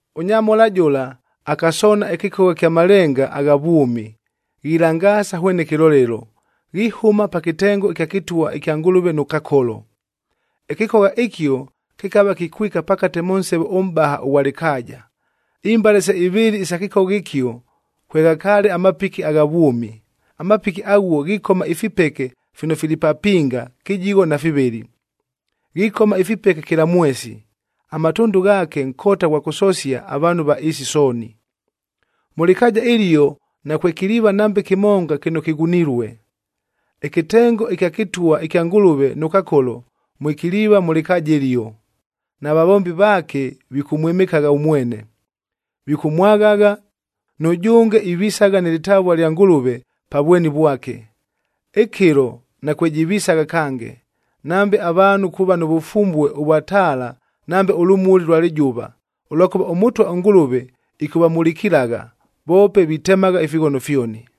Ʉnyamhola jʉla akasoona ɨkɨkogha ɨkya malenga agha vwʉmi, ghilangaasa hwene kɨlolelo, ghihʉma pa kɨtengo ɨkya kɨtwa ɨkya Ngʉlʉve nʉ Kakolo. Ɨkɨkogha ɨkio kɨkava kikwika pakate mʉ nsevo ʉmʼbaha ʉghwa lɨkaaja. Imbale se ivɨɨlɨ isa kɨkogha ɨkio kweghakaale amapiki agha vwʉmi. Amapiki aghuo ghikoma ifipeke fino fili papinga kɨjigho na fivɨlɨ. Ghikoma ifipeke kɨla mwesi, amatʉndʉ ghaake nkota ghwa kʉsosia avaanhu va ɨɨsi sooni. Mʉ lɨkaaja ɨlio nakwekiliiva nambe kɨmonga kɨno kɨghunilue. Ɨkɨtengo ɨkya kɨtwa ɨkya Ngʉlʉve nʉ Kakolo mwekiliiva mʉ lɨkaaja ɨlio, na vavombi vaake vikʉmwɨmɨkagha ʉmwene. Vikʉmwaghagha, nʉjʉnge ivisagha nɨ lɨtavua lya Ngʉlʉve pa vweni vwake. Ɨkɨlo nakwejivisagha kange, nambe avaanhu kuuva nʉ vʉfumbue ʉvwa taala nambe ʉlʉmuli ʉlwa lɨjʉva, ʉlwakʉva ʉMʉtwa ʉNgʉlʉve ɨkʉvamulikilagha, voope vitemagha ifighono fyoni.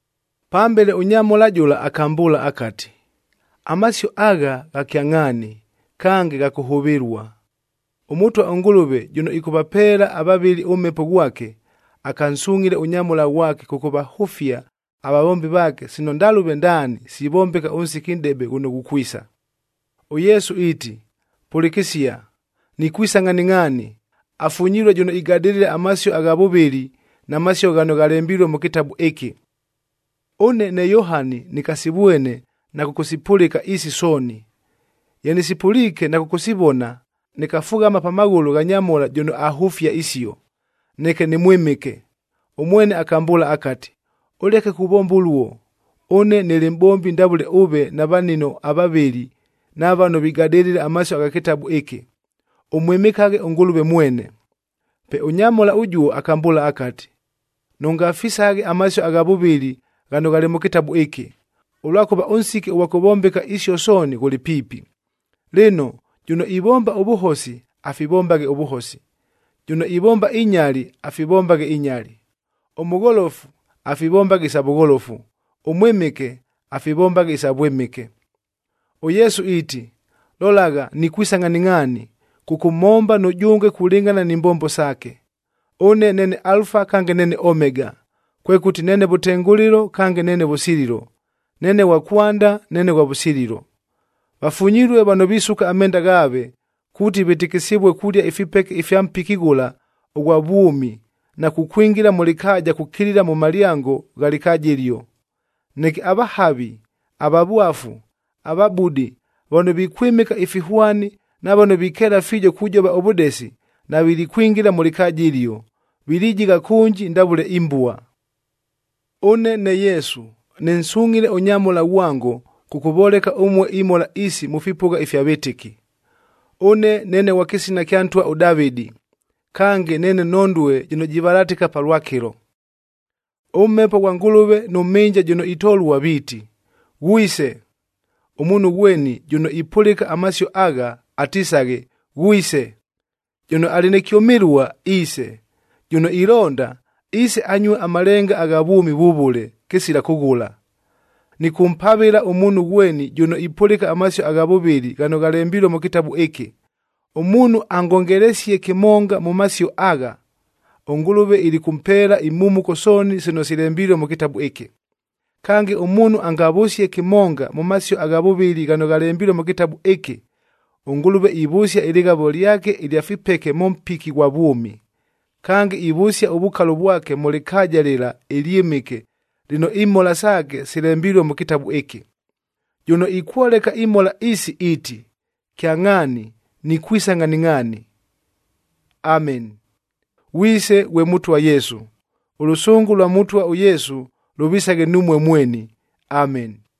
Pambele ʉnyamhola jʉla akambʉʉla akati, “Amasio agha, gha kyangʼhaani kange gha kʉhʉvɨlua. ɄMʉtwa ʉNgʉlʉve jʉno ɨkʉvapeela avavɨli ʉMhepo ghwake, akansungʼhile ʉnyamhola ghwake kʉkʉvahʉfia avavombi vaake sino ndalʉve ndaani sivombeka ʉnsiki nʼdebe ghʉno ghukwisa.” ɄYesu iiti, “Pʉlɨkɨsia, nikwisa ngʼhaningʼhaani, afunyilue jʉno igadɨlɨla amasio agha vʉvɨli na masio ghano ghalembilue mʉ kɨtabu ɨkɨ.” Ʉne ne Yohani nɨkasivwene na kʉkʉsipʉlɨka isi sooni. Ye nɨsipʉliike na kʉkʉsivona, nɨkafughama pa maghʉlʉ gha nyamhola jʉno ahʉfia isio, neke nɨmwɨmɨke. Ʉmwene akambʉʉla akati, “Ʉleke kuvomba ʉluo, ʉne nɨlɨ mʼbombi ndavʉle ʉve na vanino avavɨli na vano vigadɨlɨla amasio agha kɨtabu ɨkɨ. Ʉmwɨmɨkaghe ʉNgʉlʉve mwene!” Pe ʉnyamhola ʉjuo akambʉʉla akati, “Nʉngafisaghe amasio agha vʉvɨli ghano ghalɨ mʉ kɨtabu ɨkɨ, ʉlwakʉva ʉnsiki ʉghwa kʉvombeka isio sooni ghʉlɨ piipi. Lɨno, jʉno ivomba ʉvʉhosi afivombaghe ʉvʉhosi, jʉno ivomba inyali afivombaghe inyali. Ʉmʉgholofu afivombaghe isa vʉgholofu, ʉmwɨmɨke afivombaghe isa vwɨmɨke.” ɄYesu iiti, “Lolagha, nikwisa ngʼhaningʼhaani kʉkʉmhomba nʉjʉnge kulɨngʼhana ni mbombo saake. Ʉne neene Alufa kange neene Omega, kwekʉti neene vʉtengʉlɨlo kange neene vʉsililo. Neene ghwa kwanda, neene ghwa vʉsililo.” Vafunyilue vano visuka amenda ghaave, kuuti vɨtɨkɨsɨvue kulia ifipeke ifya mpiki ghʉla ʉghwa vwʉmi na kukwingila mʉ lɨkaaja kukilila mʉ malyango gha lɨkaaja ɨlio. Neke avahavi, avavwafu, avabudi, vano vikwɨmɨka ifihwani na vano vikeela fiijo kujova ʉvʉdesi navilikwingila mʉ lɨkaaja ɨlio, vilijigha kʉnji ndavʉle imbua. “Ʉne ne Yesu, nɨnsungʼhile ʉnyamhola ghwango kʉkʉvoleka ʉmue imhola isi mʉ fipʉgha ifya vɨtɨki. Ʉne neene ghwa kɨsina kya ntwa ʉDavɨdi. Kange, neene nhondue jɨno jivalatɨka palwakɨlo.” ɄMhepo ghwa Ngʉlʉve nʉ Mhɨnja jʉno itolua viiti, “Ghwise!” Ʉmuunhu ghweni jʉno ipʉlɨka amasio agha, atisaghe, “Ghwise!” Jʉno alɨ nɨ kyʉmɨlua iise, jʉno ilonda, iise anyue amalenga agha vwʉmi vʉvʉle, kɨsila kʉghʉla. Nɨkʉmpavɨla ʉmuunhu ghweni jʉno ipʉlɨka amasio gha vʉvɨli ghano ghalembilue mʉ kɨtabu ɨkɨ. Ʉmuunhu angongelesie kɨmonga mʉ masio agha, ʉNgʉlʉve ilikʉmpeela imhumuko sooni sino silembilue mʉ kɨtabu ɨkɨ. Kange, ʉmuunhu angavʉsie kɨmonga mʉ masio gha vʉvɨli ghano ghalembilue mʉ kɨtabu ɨkɨ, ʉNgʉlʉve ivʉsia ɨlɨghavo lyake ɨlya fipeke mʉ mpiki ghwa vwʉmi. Kange, ivʉsia ʉvukalo vwake mʉ lɨkaaja lɨla ɨlyɨmɨke lɨno imhola saake silembilue mʉ kɨtabu ɨkɨ. Jʉno ikwoleka imhola isi iiti, “Kyangʼhaani, nikwisa ngʼhaningʼhaani.” Ameni. Ghwise ghwe Mʉtwa Yesu! Ʉlʉsʉngʉ lwa Mʉtwa ʉYesu lʉvisaghe numue mweni. Ameni.